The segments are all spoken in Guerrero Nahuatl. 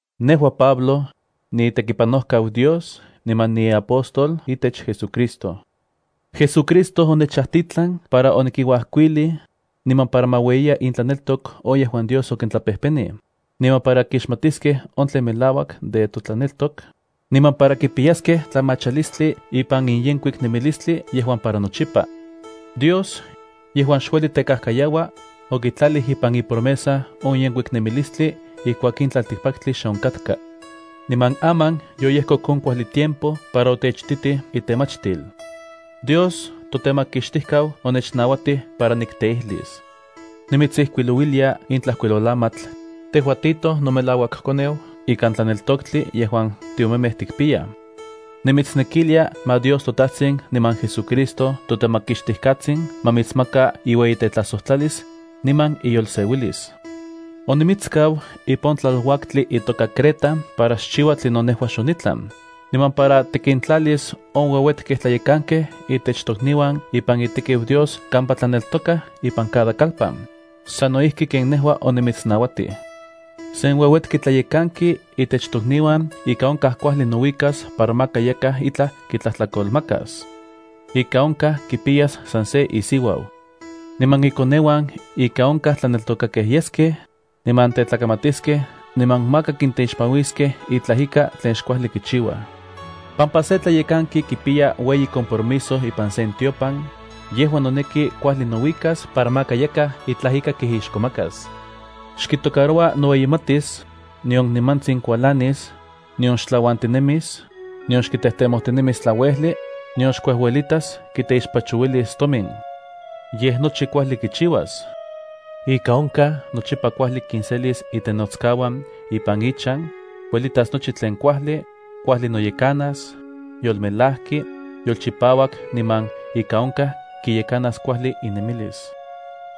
Nejua, Pablo, niitekipanojkau Dios niman niapóstol itech JesuCristo. JesuCristo onechajtitlan para onikinuajkuilij, niman para ma ueyiya intlaneltok on yejuan Dios okintlapejpenij, niman para kixmatiskej on tlen melauak de totlaneltok, niman para kipiyaskej tlamachalistli ipan in yenkuik nemilistli yejuan para nochipa. Dios, yejuan xueli tekajkayaua, okitlalij ipan ipromesa on yenkuik nemilistli ijkuak in tlaltikpaktli xe onkatka. Niman aman yoyejkok on kuajli tiempo para otechititij itemachtil. Dios toTemakixtijkau onechnauatij para nikteijlis. Nimitsijkuilouilia in tlajkuilolamatl, tejua Tito, nomelauakkoneu ikan tlaneltoktli yejuan tiomemej tikpiyaj. Nimitsnekilia ma Dios toTajtsin niman JesuCristo toTemakixtijkatsin ma mitsmaka iueyitetlajsojtlalis, niman iyolseuilis. Onimitskau ipan on tlaluaktli itoka Creta para xchiua tlinon nejua xonitlan, niman para tikintlalis on ueuetkej tlayekankej itech tokniuan ipan itekiu Dios kampa tlaneltokaj ipan cada kalpan, sano ijki ken nejua onimitsnauatij. Sen ueuetki tlayekanki itech tokniuan ika onkaj kuajli nouikas para maka yakaj itlaj kitlajtlakolmakas. Ika onkaj kipiyas san se isiuau. Niman ikoneuan ika onkaj tlaneltokakej yeskej, niman tetlakamatiskej niman maka kinteixpanuiskej itlaj ika tlen xkuajli kichiuaj. Pampa se tlayekanki kipiya ueyi compromiso ipan sen tiopan, yejua noneki kuajli nouikas para maka yakaj itlaj ika kijixkomakas. Xkitocaroua noueyimatis, nion nimantsin kualanis, nion xtlauantinemis, nion xkitejtemotinemis tlauejli, nion xkuejuelitas kiteixpachouilis tomin. Yej nochi kuajli kichiuas. Ika onkaj nochipa kuajli kinselis itenotskauan ipan ichan, kuelitas nochi tlen kuajli, kuajli noyekanas, yolmelajki, yolchipauak niman ika onkaj kiyekanas kuajli inemilis.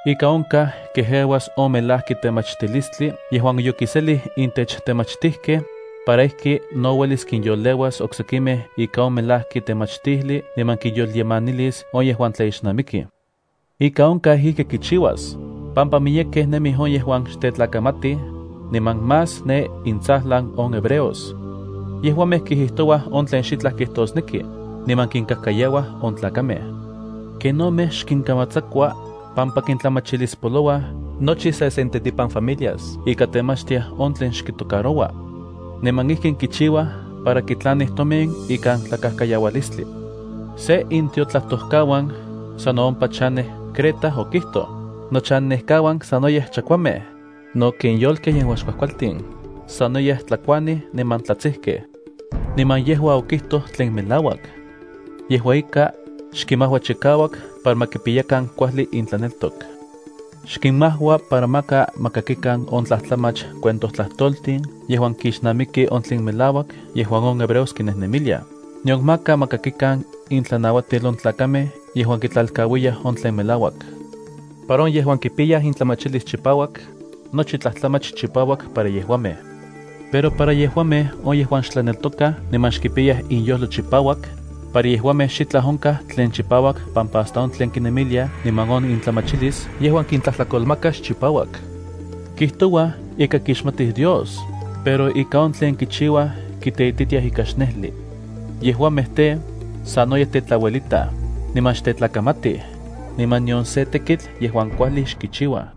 Ika onkaj kejeuas on melajki temachtilistli yejuan yokiselij intech temachtijkej, para ijki no uelis kinyoleuas oksekimej ika on melajki temachtijli niman kinyolyemanilis on yejuan tlaixnamikij. Ika onkaj ijki kichiuas, pampa miyekej nemij on yejuan xtetlakamatij, niman más ne intsajlan on hebreos. Yejuamej kijijtouaj on tlen xitlaj kijtosneki, niman kinkajkayauaj on tlakamej. Kenomej xkinkamatsakua, pampa kintlamachilispopolouaj nochi sesentetipan familias ika temachtiaj on tlen xkitocaroua. Niman ijkin kichiuaj para kitlanij tomin ikan tlakajkayaualistli. Se intiotlajtojkauan sano ompa chanej Creta okijtoj: “Nochannekauan sanoyej chakuamej, no ken yolkej yejuan xkuajkualtin, sanoyej tlakuanij niman tlatsijkej.” Niman yejua okijtoj tlen melauak. Yejua ika, xkinmajua chikauak para ma kipiyakan kuajli intlaneltok. Xkinmajua para maka ma kakikan on tlajtlamach cuentojtlajtoltin yejuan kixnamiki on tlen melauak yejuan on hebreos kinejnemiliaj, nion maka ma kakikan intlanauatil on tlakamej yejuan kitlalkauiyaj on tlen melauak. Para on yejuan kipiyaj intlamachilis chipauak, nochi tlajtlamach chipauak para yejuamej. Pero para yejuamej on yejuan xtlaneltokaj niman xkipiyaj inyojlo chipauak, para yejuamej xitlaj onkaj tlen chipauak pampa hasta on tlen kinemiliaj niman on intlamachilis yejuan kintlakolmaka xchipauak. Kijtouaj ika kixmatij Dios, pero ika on tlen kichiuaj kiteititiaj ika xnejli. Yejuamej tej, sanoyej tetlauelitaj, niman xtetlakamatij, niman nion se tekitl yejuan kuajli xkichiuaj.